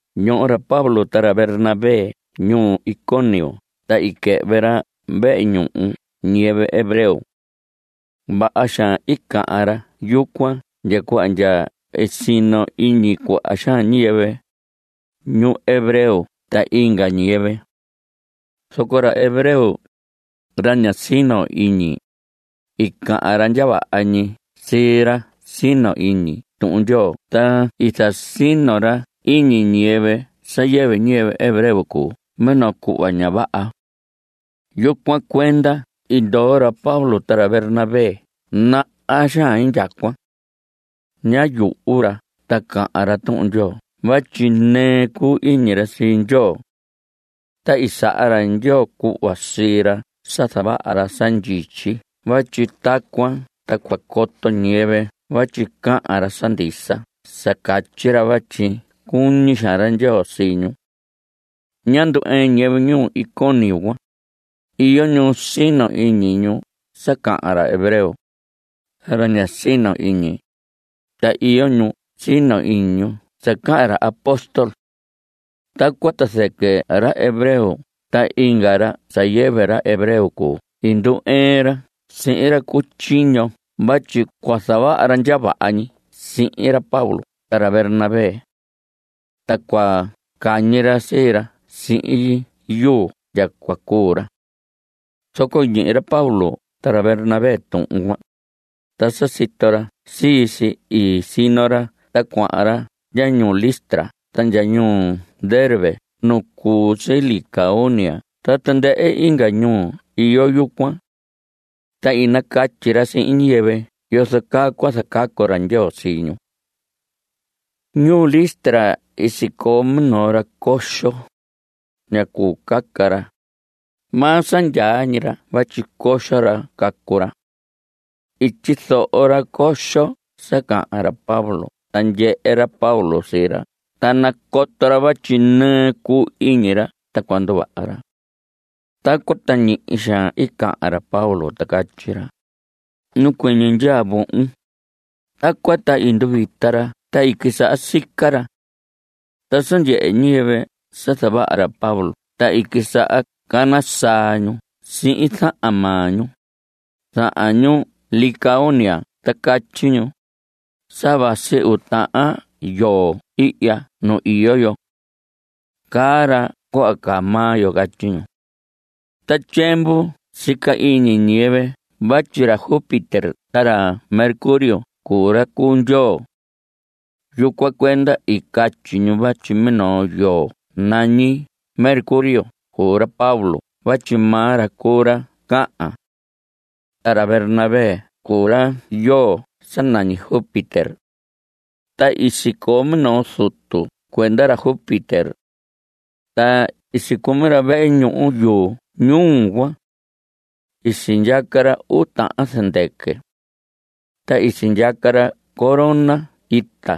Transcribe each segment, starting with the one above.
Ñoho ra Pablo ta ra Bernabé ñuu Iconio ta i quɨhvɨ ra vehe ñuhu ñiyɨvɨ hebreo. Vaha xaan i cahan ra yucuan ndya cuhva ndya i sino iñi cuaha xaan ñiyɨvɨ, ñu hebreo ta inga ñiyɨvɨ. Zoco ra hebreo, ra ña sino iñi, i cahan ra ndya vaha ñi sii ra sino iñi Tuhun Ndyoo ta i zasino ra iñi ñiyɨvɨ sa yɨvɨ ñiyɨvɨ hebreo cuu minoo cuhva ña vaha. Yucuan cuenda i ndoo ra Pablo ta ra Bernabé naha xaan indyacuan. Ñá yuhu ra ta cahan ra Tuhun Ndyoo vatyi nɨɨ cuu iñi ra sii Ndyoo. Ta i saha ra Ndyoo cuhva sii ra sa zavaha ra sa ndyityi vatyi tacuan ta cua coto ñiyɨvɨ vatyi cahan ra sa ndisa sa catyi ra vatyi cuñi xaan ra Ndyoo sii ñu. Ñá ndu‑ɨɨn ñiyɨvɨ ñuu Iconio cuan. Iyo ñu sino iñi ñu sa cahan ra hebreo, ra ña sino iñi, ta iyo ñu sino iñi ñu sa cahan ra apóstol. Tacuan ta zɨquɨ ra hebreo ta inga ra sa yɨvɨ ra hebreo cuu i ndu‑ɨɨn ra sihin ra cu tyiño vatyi cua zavaha ra ndya vaha ñi sihin ra Pablo ta ra Bernabé. Ta cua cañi ra sii ra sihin yuu ndya cua cuu ra. Zoco i ñihi ra Pablo ta ra Bernabé tuhun cuan, ta sa sito ra sii si i sino ra ta cuahan ra ndya ñuu Listra ta ndya ñuu Derbe nu cu si Licaonia ta tandɨhɨ inga ñuu iyo yucuan. Ta i nacatyi ra sihin ñiyɨvɨ yozo caa cua zacacu ra Ndyoo sii ñu. Ñuu Listra sicoo minoo ra coxo. Ñá cuu caca ra. Maa sa ndyaa ñi ra vatyi coxo ra cacu ra. I tyizoho ra coxo sa cahan ra Pablo ta ndyehe ra Pablo sii ra ta nacoto ra vatyi nɨɨ cuu iñi ra ta cua nduvaha ra. Tacuan ta ñihi xaan i cahan ra Pablo ta catyi ra: Nacuɨñɨ ndyaa vohon. Tacuan ta i nduvita ra ta i quisaha sica ra. Ta sa ndyehe ñiyɨvɨ sa zavaha ra Pablo ta i quisaha cana saa ñu sihin zahan maa ñu, zahan ñuu Licaonia ta catyi ñu: Sa vasi uu tahan ndyoo ihya nu iyo yo. Caa ra cuhva caa maa yo. Catyi ñu. Ta tyiemvu sica iñi ñiyɨvɨ vatyi ra Júpiter ta ra Mercurio cuu ra cuu Ndyoo. Yucuan cuenda i catyi ñu vatyi minoo ndyoo nañi Mercurio cuu ra Pablo vatyi maa ra cuu ra cahan. Ta ra Bernabé cuu ra ndyoo sa nañi Júpiter. Ta i sicoo minoo zutu cuenda ra Júpiter. Ta i sicumi ra vehe ñuhu yu ñuu cuan. I sindyaca ra uu tahan zɨndɨquɨ. Ta i sindyaca ra corona ita.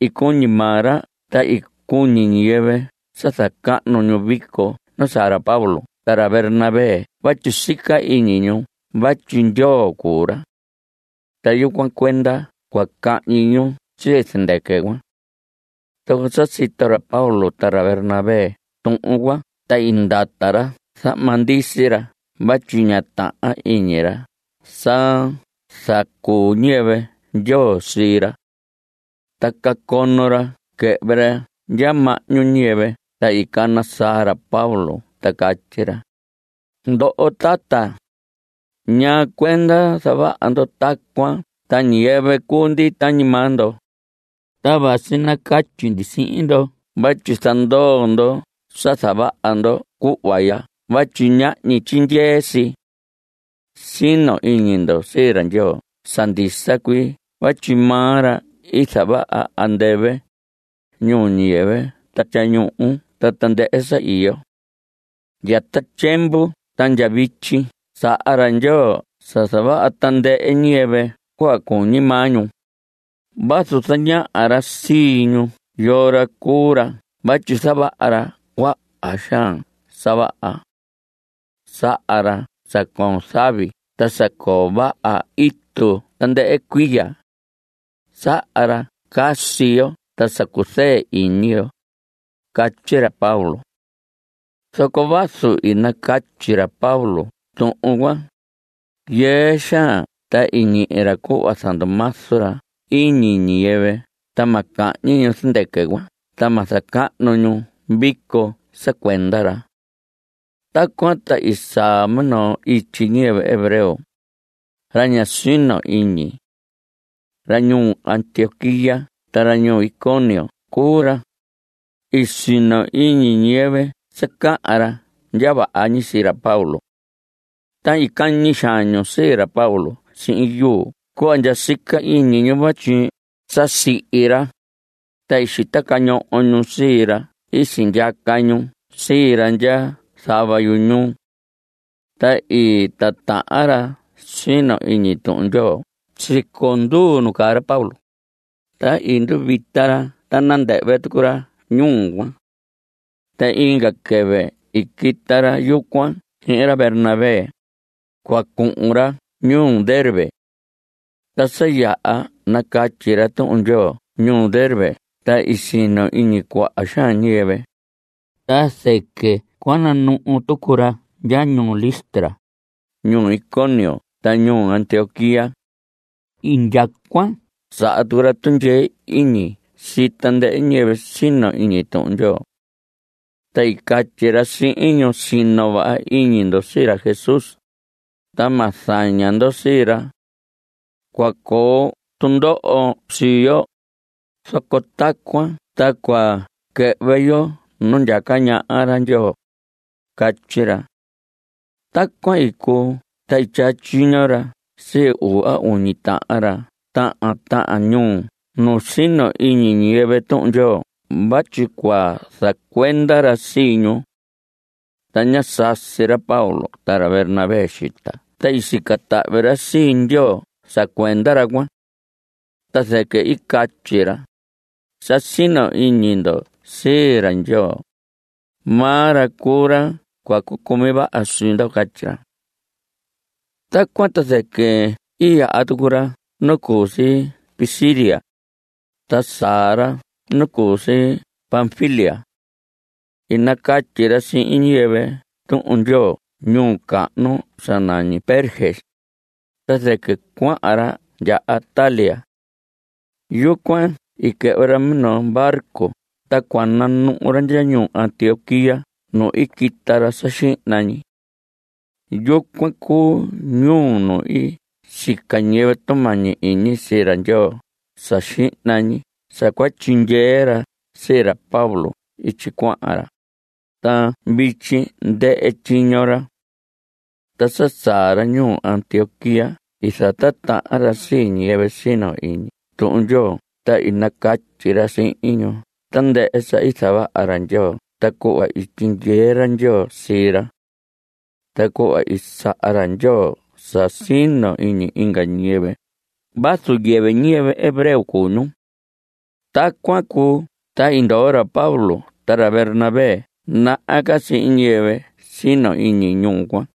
I cuñi maa ra ta i cuñi ñiyɨvɨ sa zacahnu ñu vico nu saa ra Pablo ta ra Bernabé vatyi sica iñi ñu vatyi Ndyoo cuu ra. Ta yucuan cuenda cua cahñi ñu sii zɨndɨquɨ cuan. Zoco sa sito ra Pablo ta ra Bernabé tuhun cuan ta i ndata ra zahma ndisi ra vatyi ñá tahan iñi ra sa zacuu ñiyɨvɨ Ndyoo sii ra. Ta cacono ra quɨhvɨ ra ndya mahñu ñiyɨvɨ ta i cana saa ra Pablo ta catyi ra: Ndoho tata, ¿ñaa cuenda zavaha ndo tacuan ta ñiyɨvɨ cuu ndi tañi maa ndo? ta vasi nacatyi ndi sihin ndo vatyi zandoo ndo sa zavaha ndo cuhva ya vatyi ñahñi tyindyee si. Sino iñi ndo sii ra Ndyoo sa ndisa cuii vatyi maa ra i zavaha andɨvɨ, ñuu ñiyɨvɨ ta tyañuhu ta tandɨhɨ sa iyo. Ndya ta tyiemvu ta ndya vityi saha ra Ndyoo sa zavaha tandɨhɨ ñiyɨvɨ cuhva cuñi maa ñu vazu zañaha ra sii ñu yoo ra cuu ra vatyi zavaha ra cuaha xaan sa vaha. Saha ra sa coon zavi ta sa coo vaha itu tandɨhɨ cuiya. Saha ra sa casi yo ta sa cuzɨɨ iñi yo. Catyi ra Pablo. Zoco vazu i nacatyi ra Pablo tuhun cuan, yɨɨ xaan ta i ñihi ra cuhva zandumazu ra iñi ñiyɨvɨ ta ma cahñi ñu zɨndɨquɨ cuan ta ma zacahnu ñu vico sa cuenda ra. Tacuan ta i saa minoo ityi ñiyɨvɨ hebreo, ra ña sino iñi. Ra ñuu Antioquía ta ra ñuu Iconio cuu ra. I sino iñi ñiyɨvɨ sa cahan ra ndya vaha ñi sii ra Pablo. Ta i cañi xaan ñu sii ra Pablo sihin yuu cuhva ndya sica iñi ñu vatyi sa sihi ra, ta i xita cañoho ñu sii ra i sindyaca ñu sii ra ndya zava yu ñuu. Ta i titahan ra sino iñi Tuhun Ndyoo siconduu nu caa ra Pablo, ta i nduvita ra ta nandɨhvɨ tucu ra ñuu cuan. Ta inga quɨvɨ i quita ra yucuan sihin ra Bernabé, cua cuhun ra ñuu Derbe. Ta sa yaha nacatyi ra Tuhun Ndyoo ñuu Derbe ta i sino iñi cuaha xaan ñiyɨvɨ, ta zɨquɨ cua nanuhu tucu ra ndya ñuu Listra, ñuu Iconio ta ñuu Antioquía. Indyacuan saha tucu ra tundyee iñi sii tandɨhɨ ñiyɨvɨ sino iñi Tuhun Ndyoo. Ta i catyi ra sihin ñu: Sino vaha iñi ndo sii ra Jesús, ta ma zaña ndo sii ra. Cua coo tundoho sii yo, zoco tacuan ta cua quɨhvɨ yo nu ndyaca ñaha ra Ndyoo, catyi ra. Tacuan i cuu ta i tyaa tyiño ra sii uu a uñi tahan ra tahan tahan ñuu nu sino iñi ñiyɨvɨ Tuhun Ndyoo vatyi cua zacuenda ra sii ñu. Ta ñá sasi ra Pablo ta ra Bernabé xita ta i sica tahvi ra sii Ndyoo sa cuenda ra cuan. Ta zɨquɨ i catyi ra: Sa sino iñi ndo sii ra Ndyoo. Maa ra cuu ra cua cucumi vaha sii ndo. Catyi ra. Tacuan ta zɨquɨ i yaha tucu ra nu cu si Pisidia, ta saa ra nu cu si Panfilia. I nacatyi ra sihin ñiyɨvɨ Tuhun Ndyoo ñuu cahnu sa nañi Perge, ta zɨquɨ cuahan ra ndya Atalia. Yucuan i quɨhvɨ ra minoo barco ta cua nanuhu ra ndya ñuu Antioquía nu i quita ra sa xihna ñi. Yucuan cuu ñuu nu i sica ñiyɨvɨ tumañi iñi sii ra Ndyoo sa xihna ñi sa cua tyindyee ra sii ra Pablo ityi cuahan ra. Ta vityi ndɨhɨ tyiño ra. Ta sa saa ra ñuu Antioquía i zatitahan ra sii ñiyɨvɨ sino iñi Tuhun Ndyoo ta i nacatyi ra sihin ñu tandɨhɨ sa i zavaha ra Ndyoo ta cuhva i tyindyee ra Ndyoo sii ra. Ta cuhva i saha ra Ndyoo sa sino iñi inga ñiyɨvɨ vazu yɨvɨ ñiyɨvɨ hebreo cuu ñu. Tacuan cuu ta i ndoo ra Pablo ta ra Bernabé naha ca sihin ñiyɨvɨ sino iñi ñuu cuan.